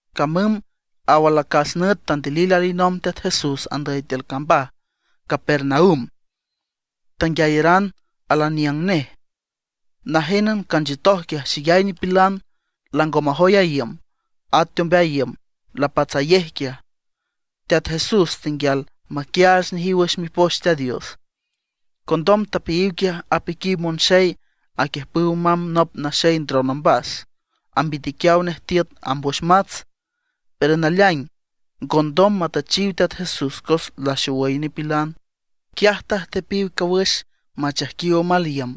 Camüm aw alacas nüt tandilil alinomb Teat Jesús andüy tiül cambaj Capernaum; tanguiayaran al aniüng nej. Najénan canchiütoj quiaj xeyay nipilan, lango majoy a iüm; at teombeay iüm lapatsayej quiaj. Teat Jesús tenguial maquiaach nejiw wüx Mipoch Teat Dios. Condom tapeayiw quiaj apiquiw monxey aquiüjpüw mamb nop naxey ndron ombas, ambitiquiaw nej tiüt amb wüx mats. Pero naleaing ngondom matüchiw Teat Jesús cos laxowüy nipilan. Quiaj tajtepiw cawüx machaijquiw omal iüm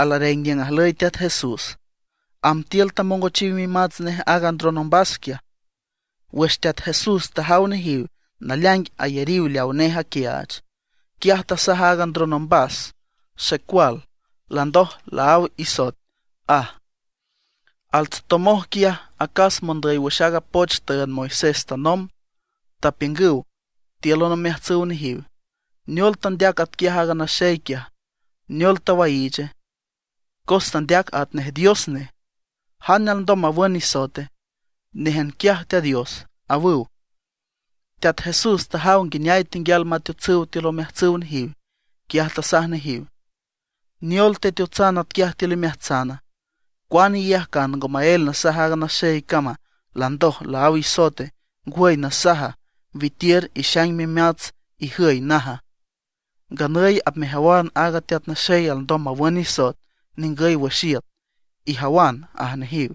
alareng niüng ajlüy Teat Jesús, amb tiül tamongochiw mimats nej aaga ndron ombas quiaj. Wüx Teat Jesús tajaw nejiw naleaing ayariw leawa nej aquiaach, quiaj tasaj aaga ndron ombas: ―Xecual, landoj laáw isoet ―aj. Altsotomoj quiaj acas mondüy wüx aaga poch tüünd Moisés tanomb, tapiüngüw tíülan omeajtsüw nejiw: “¿Neol tandeac atquiaj aaga naxey quiaja, neol tawaiiche? Cos tandeac atnej Dios nej. ¿Jane alndom mawün nisoete? Néjan quiaj Teat Dios”, awüw. Teat Jesús tajaw nguineay tenguial mateotsüw tiül omeajtsüw nejiw, quiaj tasaj nejiw: ―¿Neol teteotsan atquiaj tiül imeajtsana? ¿Cuane iyajcan ngo maél nasaj aaga naxey cama: “Landoj laáw isoete”, ngwüy nasaja: “Witiür, ixaing mimats, ijüy”, naja? Nganüy apmejawan aaga Teat Naxey alndom mawün nisoet ningüy wüx iüt. Ijawan ―aj nejiw.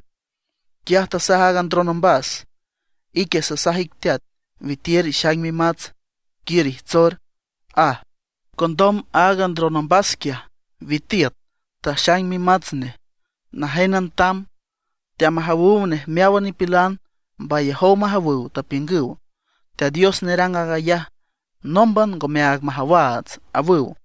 Quiaj tasaj aaga ndron ombas: ―Ique sasaj ic teat, witiür ixaing mimats, quiür ijtsor ―aj. Condom aaga ndron ombas quiaj witiüt, taxaing mimats nej, najénan tamb, teamajawüw nej meáwan nipilan. Mbayajow majawüw, tapiüngüw: ―Teat Dios nerang aag ayaj, nómban ngomeaag majawaats ―awüw.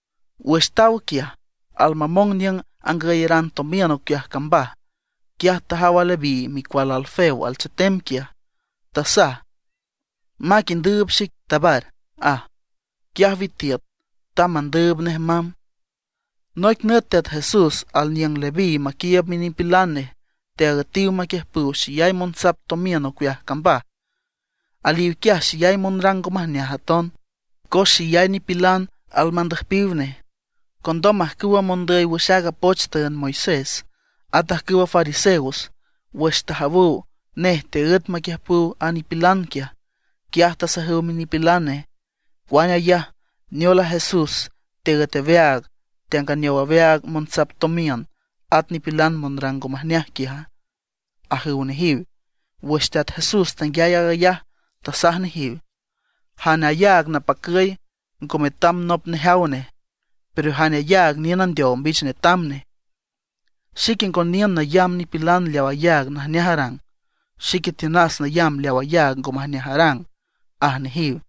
Wüx taw quiaj, al mamong niüng angüyaran tomiün ocueaj cambaj, quiaj tajaw a Leví micual Alfeo alchetem quiaj. Tasaj: ―Mac indüüb xic, tabar ―aj. Quiaj witiüt, tamb mandüüb nej mamb. Noic nüt Teat Jesús alaniüng Leví maquiiüb minipilan nej, teaüetiw maquiüjpüw xeyay monsap tomiün ocueaj cambaj. Aliw quiaj xeyay monrang ngo majneaj aton, cos xeyay nipilan almandüjpiw nej. Condom ajcüwa mondüy wüx aaga poch tüünd Moisés, at ajcüwa fariseos, wüx tajawüw nej teaǘet maquiüjpüw a nipilan quiaj, quiaj tasajüw minipilan nej: ―¿Cuane ayaj, neol a Jesús teaǘet aweaag, teanganeow aweaag monsap tomiün, at nipilan monrang ngo majneaj quiaja? ―ajüw nejiw. Wüx Teat Jesús tanguiay aag ayaj, tasaj nejiw: ―Jane ayaag napacüy ngo metam nop nejaw nej; pero jane ayaag niün andeow mbich netam nej. Xique ngo niün nayamb nipilan leawa ayaag najneaj arang; xique tiünas nayamb leaw ayaag ngo majneaj arang, aj nejiw.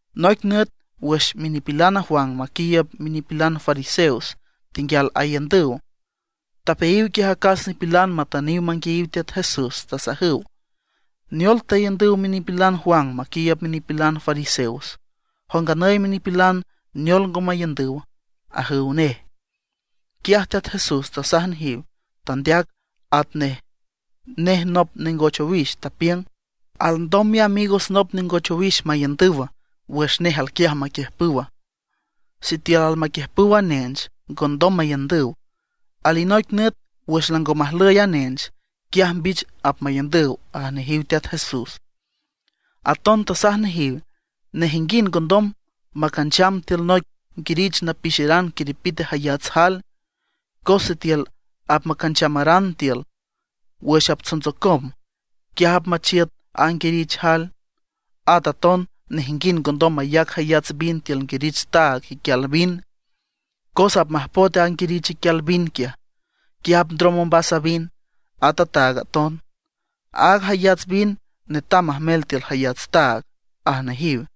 Noic nüt wüx minipilan Juan maquiiüb minipilan fariseos tenguial aiündüw, tapeayiw quiaj acas nipilan matüniw manguiayiw Teat Jesús, tasajüw: ―¿Neol taiündüw minipilan Juan maquiiüb minipilan fariseos? Jow nganüy minipilan, ¿neol ngo maiündüw? ―ajüw nej. Quiaj Teat Jesús tasaj nejiw, tandeac atnej nej nop nengoch owix. Tapiüng: ―¿Alndom miamigos nop nengoch owix maiündüw wüx nej alquiaj maquiüjpüw? Sitiül almaquiüjpüw a nench, ngondom maiündüw. Alinoic nüt wüx lango majlüy a nench, quiaj mbich apmaiündüw ―aj nejiw Teat Jesús. Aton tasaj nejiw: ―Nejinguind ngondom macancham tiül noic nguirich napixeran quiripite jayats jael, cos sitiül apmacanchamaran tiül, wüx aptsontsocom, quiaj apmachiüt a nguirich jael. At aton nejinguind ngondom mayac jayats vin tiül nguirich taag iquial vin, cos apmajpoet a nguirich iquial vin quiaj, quiaj apndrom ombas a vin, at a taag aton. Aaga jayats vin netam majmel tiül jayats taag ―aj nejiw.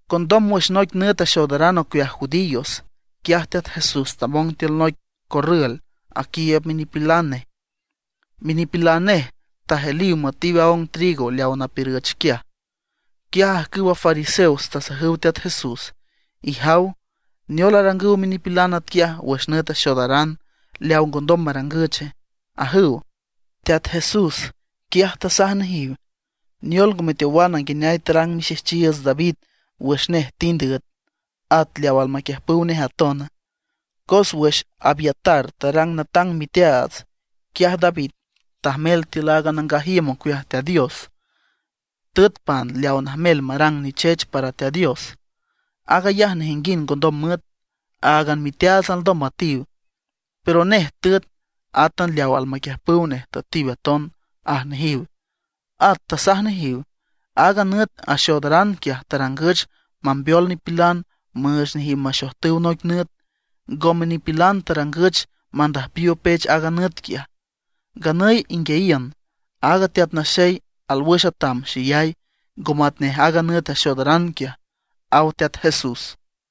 Condom wüx noic nüt axoodaran ocueaj judíos, quiaj Teat Jesús tamong tiül noic corrül aquiiüb minipilan nej. Minipilan nej tajeliw müetiw aong trigo leaw napiürüch quiaj. Quiaj ajcüwa fariseos tasajüw Teat Jesús: ―¡Ijaw! ¿Neol arangüw minipilan atquiaj wüx nüt axoodaran leaw ngondom marangüche? ―ajüw. Teat Jesús, quiaj tasaj nejiw: ―¿Neol ngo meteowan nguineay tarang mixejchiiüts David wüx nej tind üet, at leaw almaquiüjpüw nej aton? Cos wüx Abiatar tarang natang miteaats, quiaj David tajmel tiül a nangaj iüm ocueaj Teat Dios, tüet pan leaw najmel marang nichech para Teat Dios. Aag ayaj nejinguind ngondom müet, áagan miteaats alndom müetiw. Pero nej tüet, átan leaw almaquiüjpüw nej tüetiw aton ―aj nejiw. At tasaj nejiw: ―Aaga nüt axoodaran quiaj tarangüch mambeol nipilan müüch nejiw maxojtüw noic nüt; ngome nipilan tarangüch mandüjpiw opech aaga nüt quiaj. Nganüy inguiayiün, aaga Teat Naxey al wüx atam xeyay, ngo matnej aaga nüt axoodaran quiaj ―aw Teat Jesús.